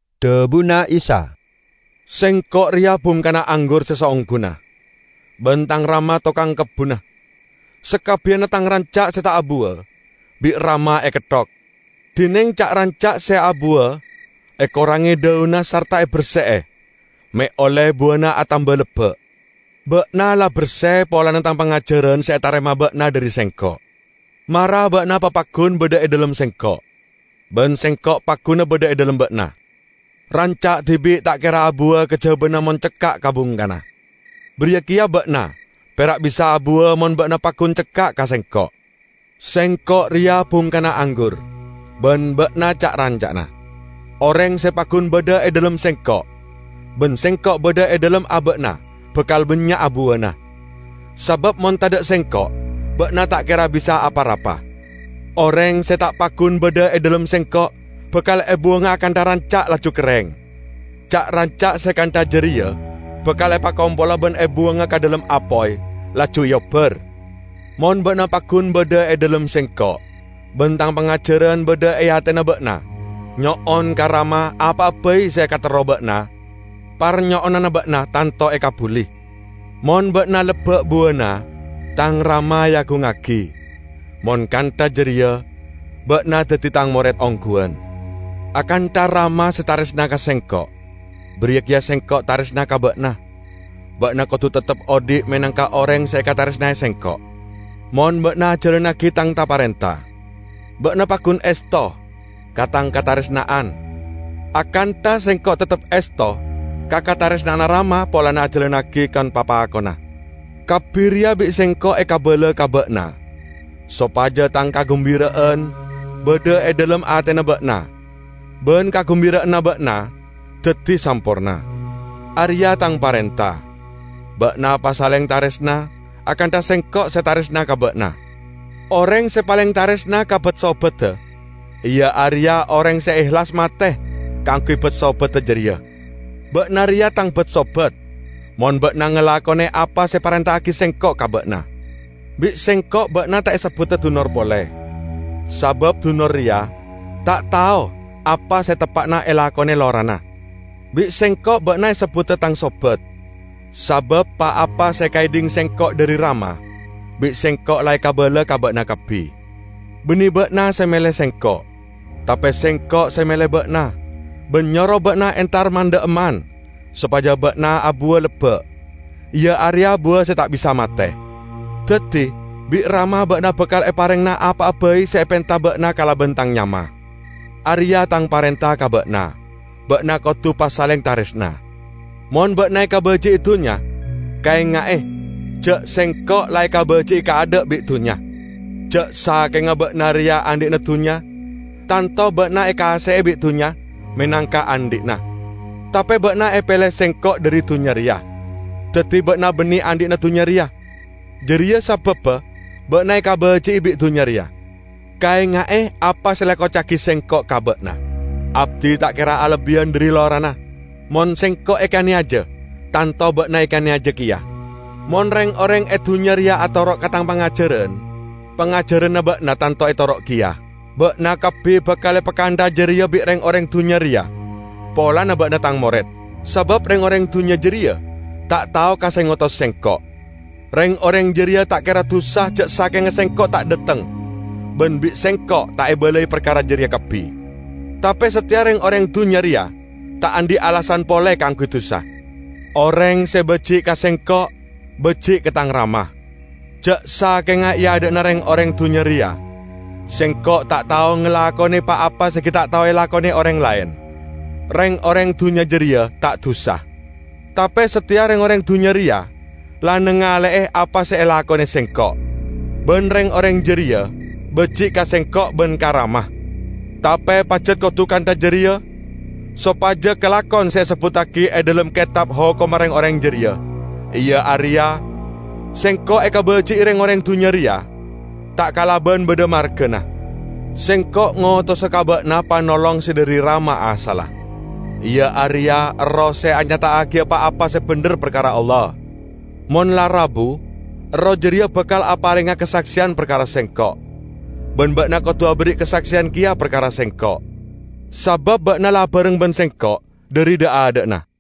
Dhabuna Isa, "Sengko' reya bungkana anggur se saongguna, ban Tang Rama tokang kebbunna. Sakabbiyanna Tang ranca' se ta' abuwa bi' Rama eketthok, dineng ca'-ranca' se abuwa ekorange dhaunna sarta eberse'e me' olle buwana atamba lebba'. Ba'na la berse polana Tang pangajaran se etarema ba'na dhari Sengko'. Mara ba'na papaggun badha e dhalem Sengko', ban Sengko' pagguna badha e dhalem ba'na. Ranca' dibi' ta' kera abuwa kajabana mon cekka' ka bungkana. Bariya keya ba'na pera' bisa abuwa mon ba'na paggun cekka' ka Sengko'. Sengko' reya bungkana anggur, ban ba'na ca'-ranca'na. Oreng se paggun badha e dhalem Sengko' ban Sengko' badha e dhalem aba'na bakal bannya'a buwana; sabab mon tadha' Sengko' ba'na ta' kera bisa apa-rapa. Oreng se ta' paggun badha e dhalem Sengko', bakal ebuwanga akantha ranca', laju kerreng. Ca'-ranca' se kantha jareya bakal epakompola ban ebuwanga ka dhalem apoy, laju eobbar. Mon ba'na paggun badha e dhalem Sengko' ban Tang pangajaran badha e atena ba'na, nyo'on ka Rama apa'a bai se ekaterro ba'na; parnyo'onanna ba'na tanto ekabbuli. Mon ba'na lebba' buwana, Tang Rama eagungngagi; mon kantha jareya ba'na daddi Tang mored ongguwan. Akantha Rama se taresna ka Sengko', bariya keya Sengko' taresna ka ba'na. Ba'na kodu teptep odhi' menangka oreng se ekataresnae Sengko'. Mon ba'na ajalannagi Tang ta-parenta, ba'na paggun esto ka Tang kataresna'an, akantha Sengko' teptep esto ka kataresna'anna Rama polana ajalannagi kon-papakonna. Kabbi reya bi' Sengko' ekabala ka ba'na sopaja Tang kagumbira'an badha e dhalem atena ba'na, ban kagumbira'anna ba'na daddi samporna. Areya' Tang parenta: ba'na pasaleng taresna, akantha Sengko' se taresna ka ba'na. Oreng se paleng taresna ka bat-sobadda iya areya oreng se ehlas mate kaangguy bat-sobadda jareya. Ba'na reya Tang bat-sobat mon ba'na ngalakone apa se eparenta'agi Sengko' ka ba'na. Bi' Sengko' ba'na ta' esebbuda dunor pole, sabab dunor reya ta' tao apa se teppa'na elakone lorana. Bi' Sengko' ba'na esebbuda Tang sobat sabab pa-apa se ekaedhing Sengko' dhari Rama, bi' Sengko' la ekabala ka ba'na kabbi. Banne ba'na se mele Sengko', tape Sengko' se mele ba'na, ban nyoro ba'na entar man-dha'emman sopaja ba'na abuwa lebba', iya areya buwa se ta' bisa mate. Daddi bi' Rama ba'na bakal eparengngana apa'a bai se epenta ba'na kalaban Tang nyama. Areya' Tang parenta ka ba'na: ba'na kodu pasaleng taresna." "Mon ba'na ekabaji'i dunnya, kaenga'e ja' Sengko' la ekabaji'i kaadha' bi' dunnya. Ja' sakenga ba'na reya andhi'na dunnya, tanto ba'na ekaase'e bi' dunnya menangka andhi'na. Tape ba'na epele Sengko' dhari dunnya reya, daddi ba'na banne andhi'na dunnya reya. Jareya sababba ba'na ekabaji'i bi' dunnya reya. Kaenga'e apa se la ekoca'agi Sengko' ka ba'na, 'Abdi ta' kera alebbiyan dhari lorana.' Mon Sengko' ekaneyaja, tanto ba'na ekaneyaja keya. Mon reng-oreng e dunnya reya atoro' ka Tang pangajaran, pangajaranna ba'na tanto etoro' keya. Ba'na kabbi bakal epakantha'a jareya bi' reng-oreng dunnya reya polana ba'na Tang mored, sabab reng-oreng dunnya jareya ta' tao ka se ngotos Sengko'. Reng-oreng jareya ta' kera dusa ja' sakenga Sengko' ta' dhateng ban bi' Sengko' ta' ebalai parkara jareya kabbi. Tape sateya reng-oreng dunnya reya ta' andhi' alasan pole kaangguy dusa. Oreng se baji' ka Sengko' baji' ka Tang Rama. Ja' sakenga e adha'na reng-oreng dunnya reya Sengko' ta' tao ngalakone pa-apa se gi' ta' tao elakone oreng laen, reng-oreng dunnya jareya ta' dusa. Tape sateya reng-oreng dunnya reya la nangale'e apa se elakone Sengko', ban reng-oreng jareya baji' ka Sengko' ban ka Rama. Tape pajat kodu kantha jareya sopaja kalakon se esebbuttagi e dhalem Ketab Hokomma reng-oreng jareya, iya areya: 'Sengko' ekabaji'i reng-oreng dunnya reya ta' kalaban badha margana.' Sengko' ngotosa ka ba'na Panolong se dhari Rama asalla. Iya areya Erroh se anyata'agiya pa-apa se bendher parkara Allah. Mon la rabu, Erroh jareya bakal aparenga kasakseyan parkara Sengko'. Ban ba'na kodu aberri' kasakseyan keya parkara Sengko', sabab ba'na la abareng ban Sengko' dhari dha'-adha'na.